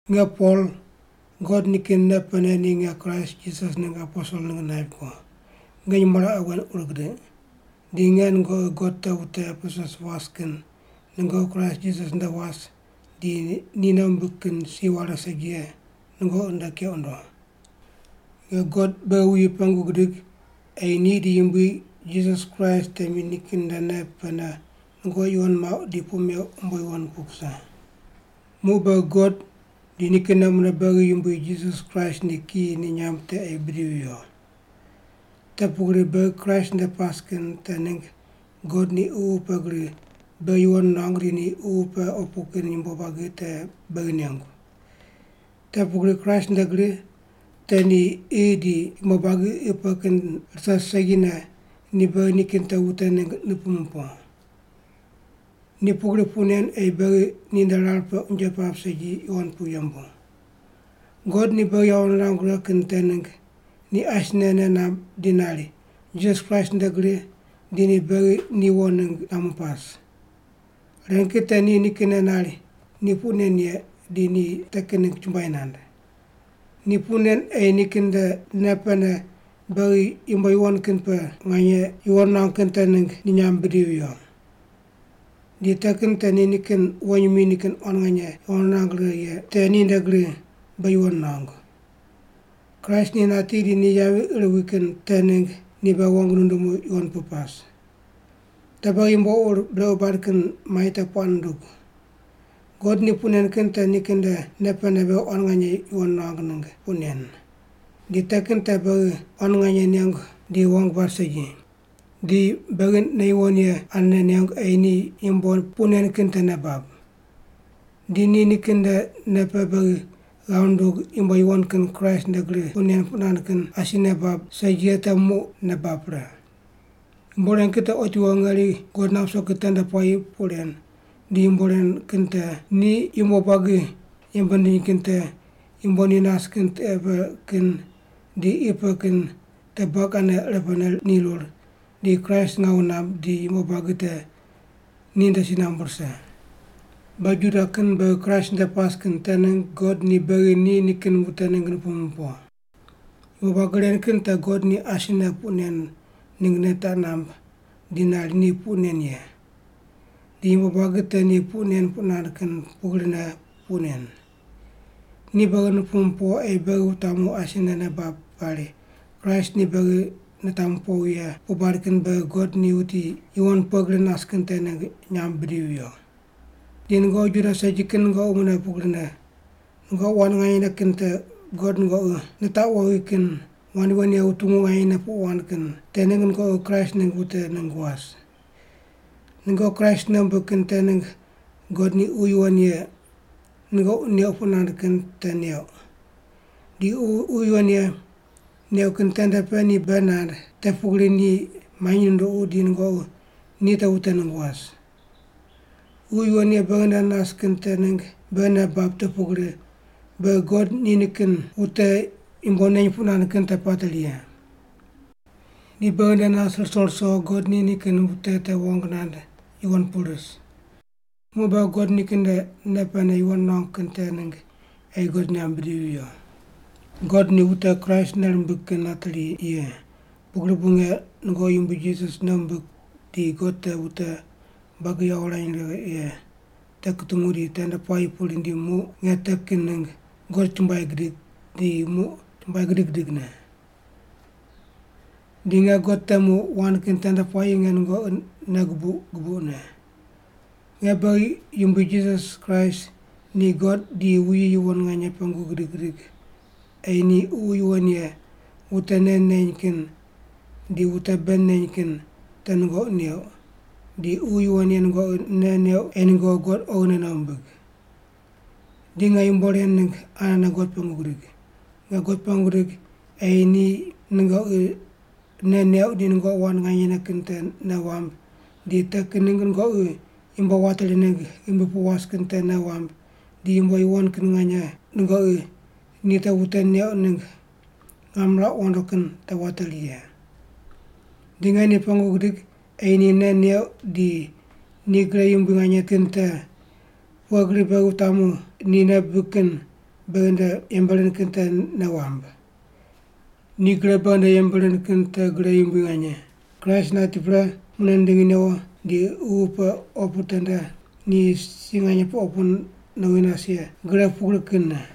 Nge Pol, God nikin nei pene ni nge Kraist Jisas ningg aposel ningg naip ko. Nge nyumo raqe wen ur gidiq. Di nge nungoqi God te wute Epesus was kin nungoqi Kraist Jisas nde was di ni nei wumbig kin si ware segi ye nungoqi nde keq wundo. Nge God beghi wuyi pengu gidig ei ni di Yumbui Jisas Kraist temi nikin nde nei pene nungoqi yuwon muauq di puq meuq umbo yuwon pu kuse. Muq beghi God di nikinne mune beghi Yumbui Jisas Kraist ni kiyi ni nyamb te ei bidivi viyo. Te pugri beghi Kraist nde pas kin te ningg God ni Ququ pe gri beghi yuwon nuangu di ni ququ pe opu kin yumbo buagi te beghi nengu. Te pugri Kraist nde gri te ni qi di yumbo buagi qi pe kin rise segine ni beghi nikin te wute ningg nupumu po. Ni pugri puq nen ei beghi ninde rar pe unje pap segi yuwon pu yembu. God ni beghi yawo nirangu righe kin te ningg, ni asine nei namb di nari, Jisas Kraist nde gri di ni beghi ni wo ningg nuamu pas. Ren kin te ni nikinne nari ni puq nen ye di ni te kin ningg chumbuai nand. Ni puq nen ei nikin nde nei pene beghi yumbo yuwon kin pe nganye yuwon nuangu kin te ningg ni nyamb bidivi viyo. Di te kin te ni nikin wonyimi nikin quan nganye yawo nirang righe ye te ninde gri beghi yuwon nuangu. Kraist ni nati di ni yavi ir wi kin te ningg ni beghi wong nundumu yuwon pu pas. Te beghi yumbo ur brequ bad kin mai te puaq nundug. God ni puq nen kin te nikin nde nei pene beghi quan nganye yuwon nuangu ningg puq nen. Di te kin te beghi quan nganye nengu di wong bad segi. Di beghi nei yuwon ye anene nengu ei ni yumbo puq nen kin te nei bab. Di ni nikin nde nei pe beghi ghav nundug yumbo yuwon kin Kraist nde gri puq nen puq nand kin asi nei bab segi ye te muq nei bab pre. Yumbo ren kin te otiwo ngeri God nap ruso kin tende puayi puq ren, di yumbo ren kin te: Ni yumbo buagi yembe nindiny kin te yumbo ni nas kin tiqe pe kin di qi pe kin te buagi ane irepene nirur, di Kraist ngawu namb di yumbo buagi te ninde si nambu rise. Beghi Juda kin beghi Kraist nde pas kin te ningg God ni beghi ni nikin wute ningg nupumu po. Yumbo buagi ren kin te God ni asine puq nen ningg nei taq namb di nari ni puq nen ye. Di yumbo buagi te ni puq nen puq nand kin pugrine puq nen. Ni beghi nupumu po ei beghi wutamu asine nei bab pari Kraist ni beghi nitamu powi ye puq bad kin beghi God ni wuti yuwon pughe gri nas kin te ningg nyamb bidivi viyo. Di nungoqi Juda segi kin nungoqi mune pugrine. Nungoqi wand nganyene kin te God nungoqi nitaqu wowi kin wand yuwon ye wutungu nganyene puq wand kin te ningg nungoqi Kraist ningg wute ningg was. Nungoqi Kraist nei wumbig kin te ningg God ni Ququ Yuwon Ye nungoqi neuq puq nand kin te neuq. Di Ququ Yuwon Ye neuq kin tende pe ni bei nand te pugri ni manyi nunduqu di nungoqi ni te wute ningg was. Ququ Yuwon Ye beghi nde nas kin te ningg beghi nei bab te pugri beghi God ni nikin wute yumbo neny puq nand kin te pateri ye. Ni beghi nde nas ruso ruso God ni nikin wute te wong nand yuwon pu ris. Muq beghi God nikin nde nei pene yuwon nuangu kin te ningg ei God nyamb bidivi viyo. God ni wute Kraist nei rimbig kin nateri ye, pugri bu nge nungoqi Yumbui Jisas nei wumbig di God te wute buagi yawo wurany righe ye te kutungu di tende puayi pu rindi muq nge te kin ningg God chumbuai gidig di muq chumbuai gidig gidigne. Di nge God temu wand kin tende puayi nge nungoqi nei gubuq gubuqne. Nge beghi Yumbui Jisas Kraist ni God di wuyi yuwon nganye pengu gidig gidig ei ni Ququ Yuwon Ye wute nei neny kin di wute bei neny kin te nungoqi neuq, di Ququ Yuwon Ye nungoqi nei neuq ei nungoqi God oghine nei wumbig. Di nge yumbo ren ningg anene God pengu gidig. Nge God pengu gidig ei ni nungoqi nei neuq di nungoqi wand nganyene kin te nei wamb di te kin ningg nungoqi yumbo wateri ningg ghimbi pu was kin te nei wamb di yumbo yuwon kin nganye nungoqi ni te wute neuq ningg ngam nirauq wondo kin te wateri ye. Di nge ni pengu gidig ei ni nei neuq di ni gre yumbui nganye kin te pughe gri beghi wutamu ni nei bibig kin beghi nde yembe rind kin te nei wamb. Ni gre beghi nde yembe rind kin te gre yumbui nganye, Kraist nati pre mune nindingi newo di ququ pe opu tende ni si nganye pe opu nowi nas ye gre pugri kinne.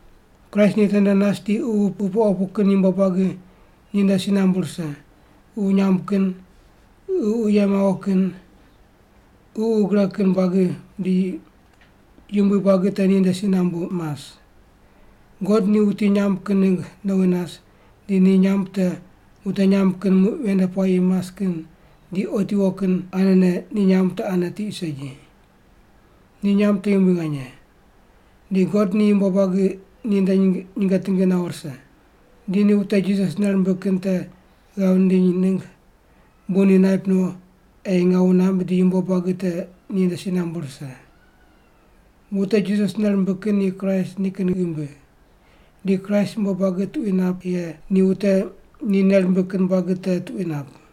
Kraist ni tende nas di ququ pe opu kin yumbo buagi ninde si nambu rise, ququ nyamb kin, ququ ye mawo kin, ququ gre kin buagi di yumbui buagi te ninde si nambu mas. God ni wuti nyamb kin ningg nowi nas di ni nyamb te wute nyamb kin muq ven nde puayi mas kin di otiwo kin anene ni nyamb te ane tiq segi. Ni nyamb te yumbui nganye. Di God ni yumbo buagi ninde nyinge tingi nawo rise. Di ni wute Jisas nei rimbig kin te ghav nindiny ningg bu ni naip no ei ngawu namb di yumbo buagi te ninde si nambu rise. Wute Jisas nei rimbig kin ni Kraist nikin ghimbi. Di Kraist yumbo buagi tuqui nap ye ni wute ni nei rimbig kin buagi te tuqui nap.